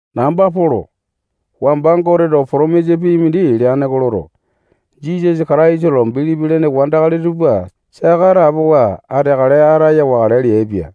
Namba Polo. Wamba Goteto potomisa pii mindi leane oko loto, Jisasa Kataisa lo bilipi lene wandakali tupa saka atapowa ateakale ataya wakale leaipia.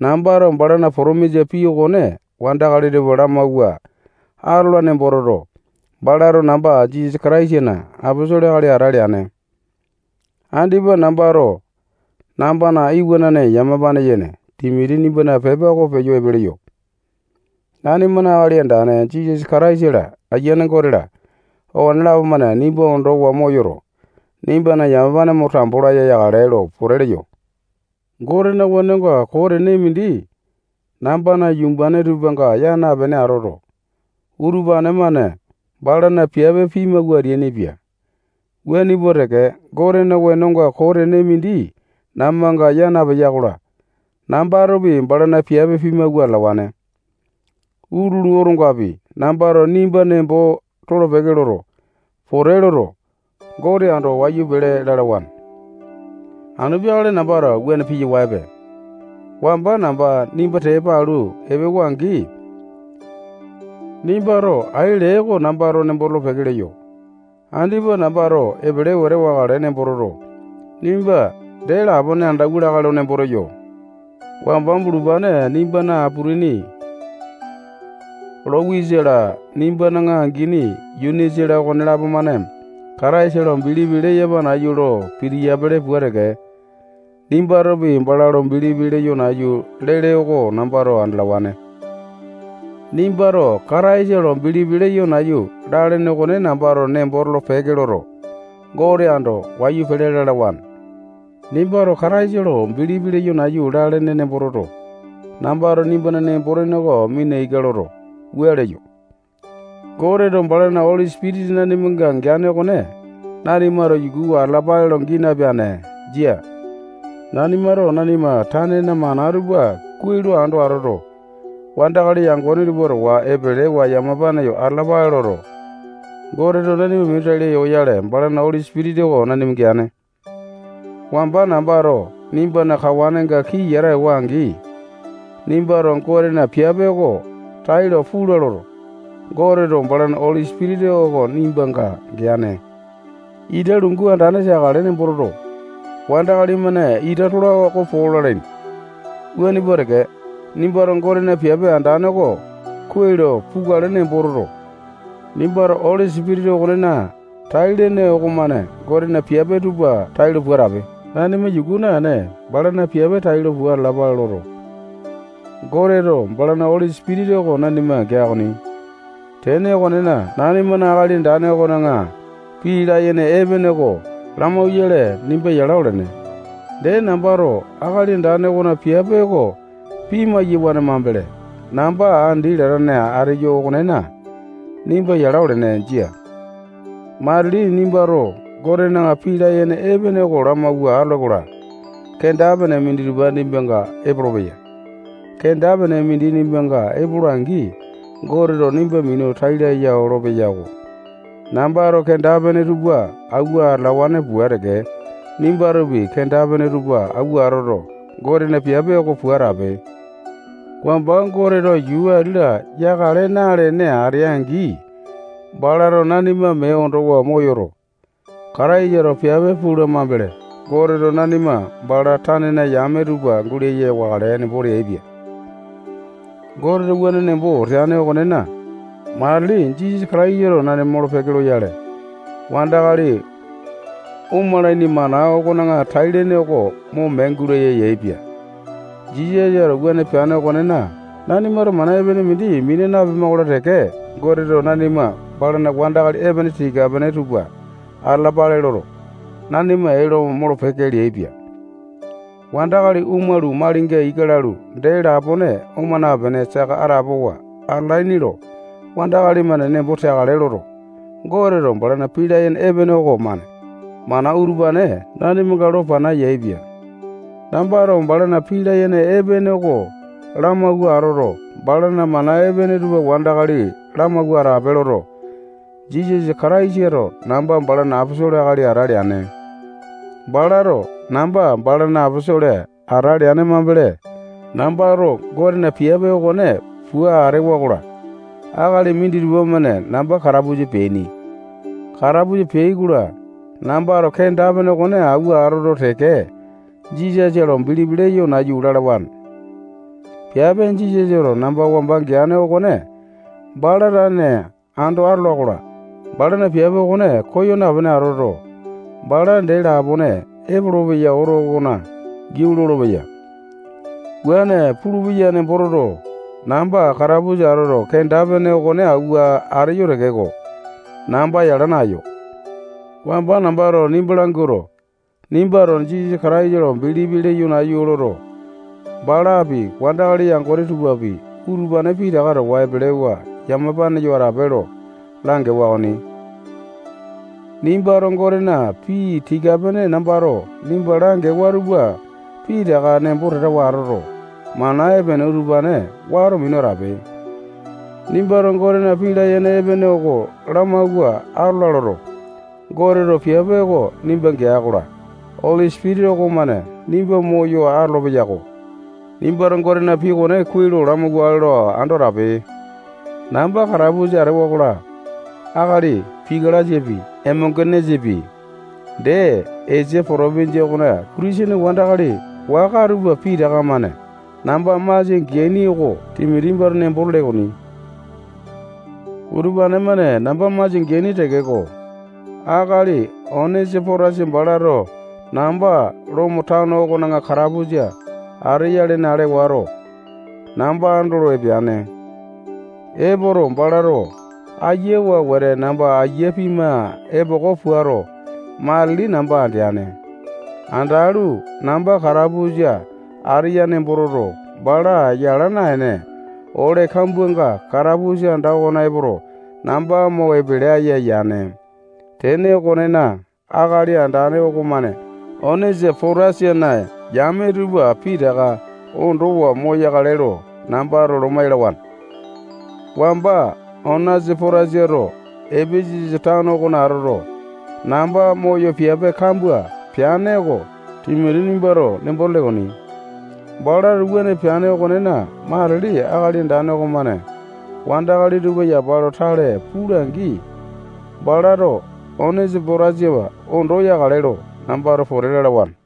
Nambato balana potomisa pii okone wandakali tupa lamawua atola nembo toto, balato namba Jisasa Kataisana aposolo akali ata leane. Andipa nambato nambana iwanane yamapane yene Timoti nimbana pepa oko peyo epe leyo. Nanimana Akali Andane Jisasa Kataisa-la, Ayiane Gote-la, okonelapo-mane nimba ondowa moyoto, nimbana yamapane mo tambo laya yakale lo pote leyo. Gotena wenonga koo tene mindi nambana yumbane tupanga yaa napene atoto, utupane-mane balana piape pimawua ateainipia. Wuane pua teke, Gotena wenonga koo tene mindi nambanga yaa napeya-kola, nambatopi balana piape pimawua atalawane. Utulu otongapi, nambato nimba nembo tolo-peke loto, pote loto, Gote ando wayu pele lalawane. Anu peakale nambato wuane piyawaepe. Wamba namba nimba tepa alu epewa-angi, nimbato ai lee oko nambato nembo tolo-peke leyo. Andipa nambato epele wete wakale nembo toto, nimba dee lapone andauwa lakae lo nemboto ateyo. Wamba bulupane nimbana aputini Lowisa-la, nimbana angini Yunisa-la, okonelapo-mane Kataisa lo bilipi leyapa nayu lo pitiyapili pua teke, nimbatopi bala lo bilipi leyo nayu lele oko nambato andalawane. Nimbato Kataisa lo bilipi leyo nayu lalene okone nambato nembo tolo-peke loto, Gote ando wayu pele lalawane. Nimbato Kataisa lo bilipi leyo nayu lalene nembo toto, nambato nimbana nembo-tene oko mina ika loto, wua leyo: Goteto balana Oli Sipitisa nanimanga geane okone nanimato yukuwa atalapale lo gii napeane. Jia. Nanimato nanima tanena mana tupa kuai lo ando atoto, wandakali yangone tupa towa epelewa yamapane yo atalapale loto, Goteto nanima minu tai laya oyale, balana Oli Sipitisa oko nanima geane. Wamba nambato nimbana kawanenga kii yata ewa-angi, nimbato Gotena piape oko tailo pula loto, Goteto balana Oli Sipitisa oko nimbanga geane. Ita lungu andane teakale nembo toto, wandakali-mane ita tola oko po lalaini. Wuane pua teke, nimbato Gotena piape andane oko kuai lo pukale nembo toto, nimbato Oli Sipitisa okonena tai-lene okomane Gotena piape tupa tailo pua atape. Nanima yuku naene, balana piape tailo pua atalapale loto, Goteto balana Oli Sipitisa oko nanima gea okoni. Tene okonena, nanimana Akali Andane okona pii layene epene oko lamauyale nimba yala olene. Dee, nambato Akali Andane okona piape oko pimai-yawane mambele, namba andi latane ateyo okonena, nimba yala olene. Jia. Matili nimbato Gotena pii layene epene oko lamawua atole-kola, kenda-pene minditupa nimbanga epolopeya. Kenda-pene mindi nimbanga epola-angi, Goteto nimba minu tai laya olopeya-ko. Nambato kenda-pene tupa awua atalawane pua teke, nimbatopi kenda-pene tupa awua atoto, Gotena piape oko pua atape. Wamba Goteto yuu ati-la yakale nalene atea-angi, balato nanima mee ondowa moyoto, Kataisato piape pula mambele, Goteto nanima bala tanena yame tupa gulaya wakale nembo teaipia. Goteto wuane nembo teane okonena, matili Jisasa Kataisato nanima molo-peke loyale, wandakali omalaini mana okona tai-lene oko mo mee gulaya yaepia. Jisasato wuane peane okonena, nanimato mana epene mindi mina napema-kola teke, Goteto nanima balana wandakali epene tika-pene tupa atalapale loto, nanima ee lo molo-peke leaipia. Wandakali omalu, malinga ika lalu, dee lapone oma napene, saka atapowa atalaini lo wandakali-mane nembo teakale loto, Goteto balana pii layene epene okomane mana utupane nanimanga lo pana yaepia. Nambato balana pii layene epene okone lamawua atoto, balana mana epene tupa wandakali lamawua atape loto, Jisasa Kataisato namba balana aposolo akali ate leane. Balato namba balana aposolo ate leane mambele, nambato Gotena piape okone pua atewa-kola, akali minditupa-mane namba katapusa peaini. Katapusa peai-kola, nambato kenda-pene okone awua atoto teke, Jisasa lo bilipi leyo nayu lalawane. Piape Jisasato namba wamba geane okone bala tane ando atola-kola, balana piape okone koya napene atoto, bala dee lapone epolopeya oto okona giau lolopeya. Wuane pulupeya nembo toto, namba katapusa atoto, kenda-pene okone awua ateyo tekeko, namba yala naeyo. Wamba nambato nimba languato, nimbato Jisasa Kataisa lo bilipi leyo nayu loto, balapi, wandakali yangone tupapi, utupane pitaka towa epelewa yamapane yo atape lo langewa okoni. Nimbato Gotena pii tika-pene nambato nimba langewa tupa pitaka nembo tatawa atoto, mana epene utupane wato minu atape. Nimbato Gotena pii layene epene oko lamawua atola loto, Goteto piape oko nimba gea-kola, Oli Sipitisa okomane nimba moyo atolo-peyako. Nimbato Gotena pii okone kuai lamawakale lo ando atape. Namba katapusa atewa-kola, akali Pika-lasapi, Emonge-nesapi, dee Esia potopinjia okona Kitisene wandakali waka tupa pitaka-mane namba masia geaini oko Timoti nimbato nembo tele okoni. Utupane-mane namba masia geaini tekeko, akali Onesi-potasa balato namba Lomo tano okona katapusa ateya lene ale wato, namba andolo epeane. Epoto, balato ayawa wete namba aiya pima epoko puato, matili namba andeane. Andalu, namba katapusa ateya nembo toto, bala yala naene, ole kambuanga katapusa anda okona epoto, namba mo epele aya yane. Tene okonena, Akali Andane okomane Onesi-potasana yame tupa pitaka ondowa moyakale lo nambato loma yalawane. Wamba Onesi-potasato Epesasa tano okona atoto, namba moyo piape kambua peane oko Timoti nimbato nembo tele okoni. Balato wuane peane okonena, matili Akali Andane okomane wandakali tupa yapa lo tale pula-angi, balato Onesi-potasa ondo yakale lo nambato pote lalawane.